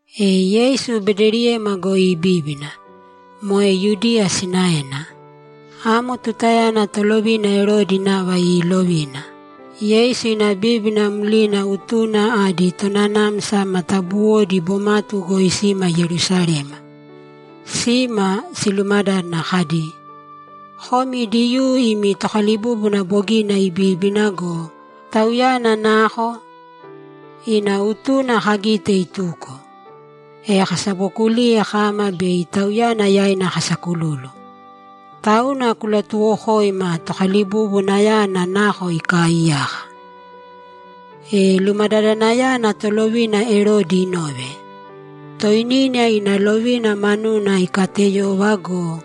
E Yeisu Bedeliyema goi ibíbina, moe Yudiya sinaena. Amo tutayana tolovina Erodi nava iilovina. Yeisu ina bíbina mlina utuna adi tonanamsa ma matabuwodi bomatu goi sima Yerusalema. Sima, silumadádana kadi, ‘Komi Diyuu imi Tokalibúbuna bogina ibíbina go, Tauyana nako? Ina utuna kagite ituko, e kasabokuliye kama bei Tauyana yaina kasakululu. Tauna kulatuwokōima Tokalibubunayana nako ikaaiyaka.’ E lumadadanayana tolovina Erodi inove, toinina ina lovina manuna ikateyova go,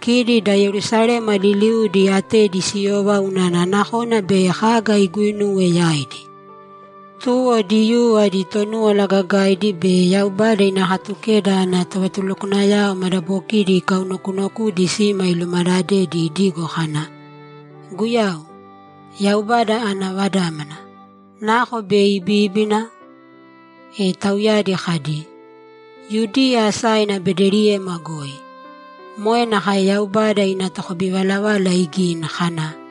kidi da Yerusalema liliudi atedi siyova unana nakona bei kaga iguinuwe yaidi. Tuwo Diyuu adi Tonúwala Gagaidi be Yaubada ina Katukeda ana tovatulukwanayao madabokidi ikaunokunokudi sima ilumadadedi idigo kana, ‘Guyau, Yaubada ana Vadámana, nako bei ibíbina?’ E tauyadi kadi, ‘Yudiya asaina Bedeliyema goi. Moe nakae Yaubada ina tokabivalavala igini kana,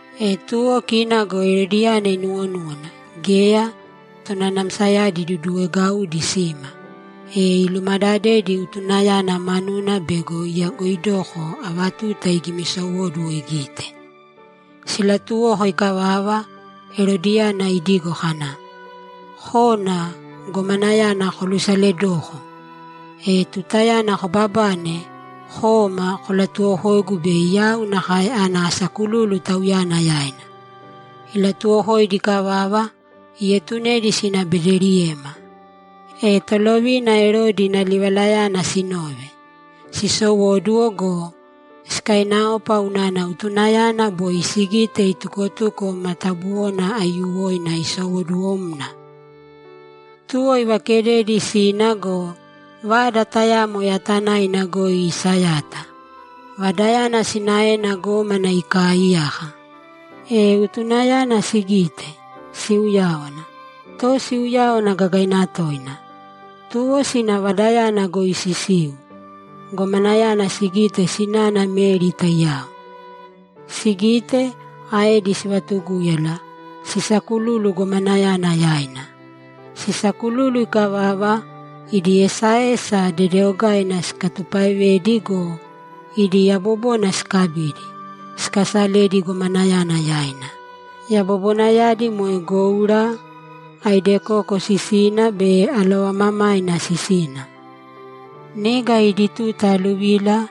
E tuwo kina go Erodiyana inuwonúwana, geya, tonanamsayadi iduduwegaudi sima, e ilumadadedi utunayana manuna bego iyagoidoko ava tuta igimisowóduwo sigite. Silatuwoko ikavava, Erodiyana idigo kana, ‘Kōna gomanayana kolusaledōko. E tutayana kobabane, kōma kolatuwokōigu bei yau nakae ana asakululu Tauyana yaina.’ Ilatuwokoidi ikavava, ietunedi sina Bedeliyema. E tolovina Erodi ina livalayana sinove, sisowóduwo go, sikainaopa unana utunayana boi sigite itukotuko matabuwona aiyuwoina isowoduwomna! Tuwo ivakededi sina go, vada tayamo yatanaina goi isayata. Vadayana sinaena gómana ikaaiyaka. E utunayana sigite, siuyáwana, to siuyáwana gagaina toina. Tuwo sina vadayana goi sisiu, gomanayana sigite sinana Meri taiyao. Sigite, aedi sivatugúyala, sisakululu gomanayana yaina. Sisakululu ikavava, idi esaesa dedeogaidi sikatupaevedi go, idi yabobona sikabidi, sikasaledi gomanayana yaina. Yabobonayadi moe goura, aidekoko sisina be alovamamaina sisina. Niga idi tuta aluvila,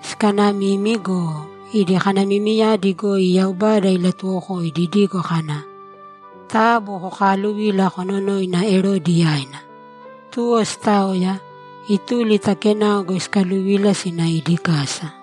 sikanamimi go, idi kanamimiyadi goi Yaubada ilatuwokoidi idigo kana, ‘Taabu kokaaluvīla kononōina Erodi yaina.’ Tuwo sitaoya, ituli ta kenao goi sikaluvila sina idi kasa.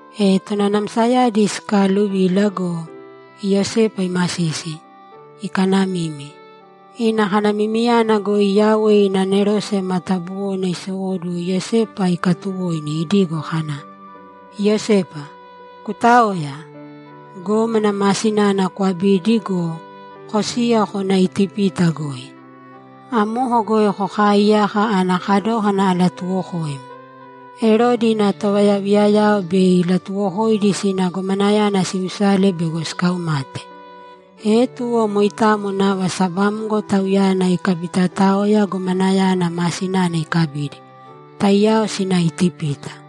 E tonanamsayadi sikaaluvila go, Iyosepa imasisi, ikanamimi. Ina kanamimiyana goi Yauwe ina anerose matabuwona isowóduwo Iyosepa ikatuwoini idigo kana, ‘Iyosepa, kutāoya! Gómana ma sinana kwabīdi go, kosīya kōna Itipita goi. Amoko goi kokaaiyāka ana kadókana alatuwokoim. Erodi ina tovayaviyayao bei ilatuwokoidi sina gomanayana silusale bego sikaumate.’ E tuwo moitamo nava sabamgo tauyana ikabitaotaoya gomanayana ma sinana ikabidi, taiyao sina Itipita.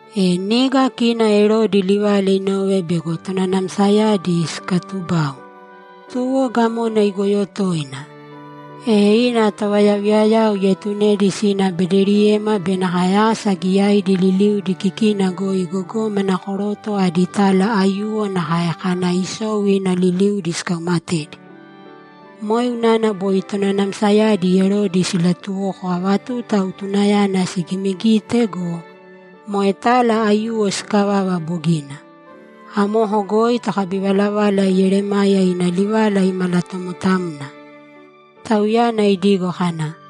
E niga kina Erodi livala inove bego tonanamsayadi sikatubau, tuwo gamona igoyo toina. E ina tovayaviyayao ietunedi sina Bedeliyema be nakae asa giyaidi liliudi kikina goi gogómana koroto adi tala aiyuwo nakae kana isou ina liliudi sikaumatedi. Moe unana boi tonanamsayadi Erodi silatuwoko ava tuta utunayana sigimigite go, moe tala aiyuwo sikavava bogina. Amoko goi tokabivalavala Yeremaya ina livala imalatomotamna, tauyana idigo kana,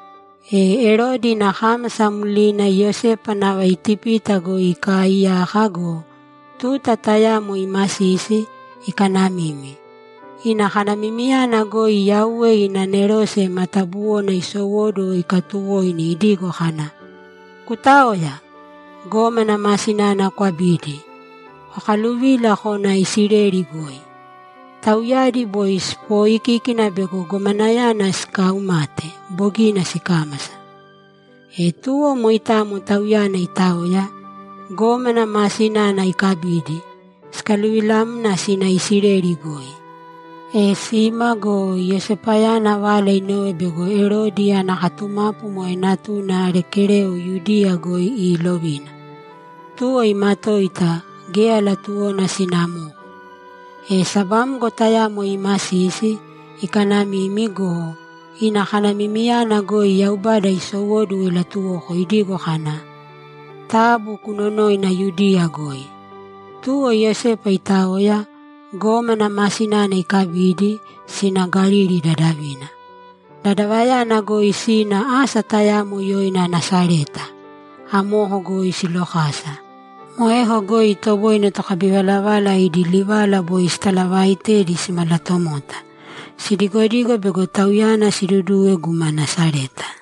E Erodi ina kámasa mlina Iyosepa nava Itipita goi ikaaiyaka go, tuta tayamo imasisi, ikanamimi. Ina kanamimiyana goi Yauwe ina anerose matabuwona isowóduwo ikatuwoini idigo kana, ‘Kutāoya! Gómana ma sinana kwabīdi, kokaluvīla kōna Isileli goi. Tauyadi boi sipooikíkina bego gomanayana sikaaumate bogina sikámasa.’ E tuwo moitamo tauyana itaoya, gómana ma sinana ikabidi, sikaluvilamna sina Isileli goi. E sima go, Iyosepayana vala inove bego Erodi ana katumapu moe natuna Arekeleo Yudiya goi iilovina. Tuwo imatoita; geya latuwona sina amoko. E sabamgo tayamo imasisi, ikanamimi go, ina kanamimiyana goi Yaubada isowóduwo ilatuwoko idigo kana, ‘Taabu kunonōina Yudiya goi.’ Tuwo Iyosepa itaoya, gómana ma sinana ikabidi, sina Galili dadavina. Dadavayana goi sina asa tayamo yoina Nasareta; amoko goi silokasa. Moeko goi itoboine tokabivalavala idi livala boi sitalavaaitedi simalatomota. Sidigodigo bego Tauyana siduduwe guma Nasareta.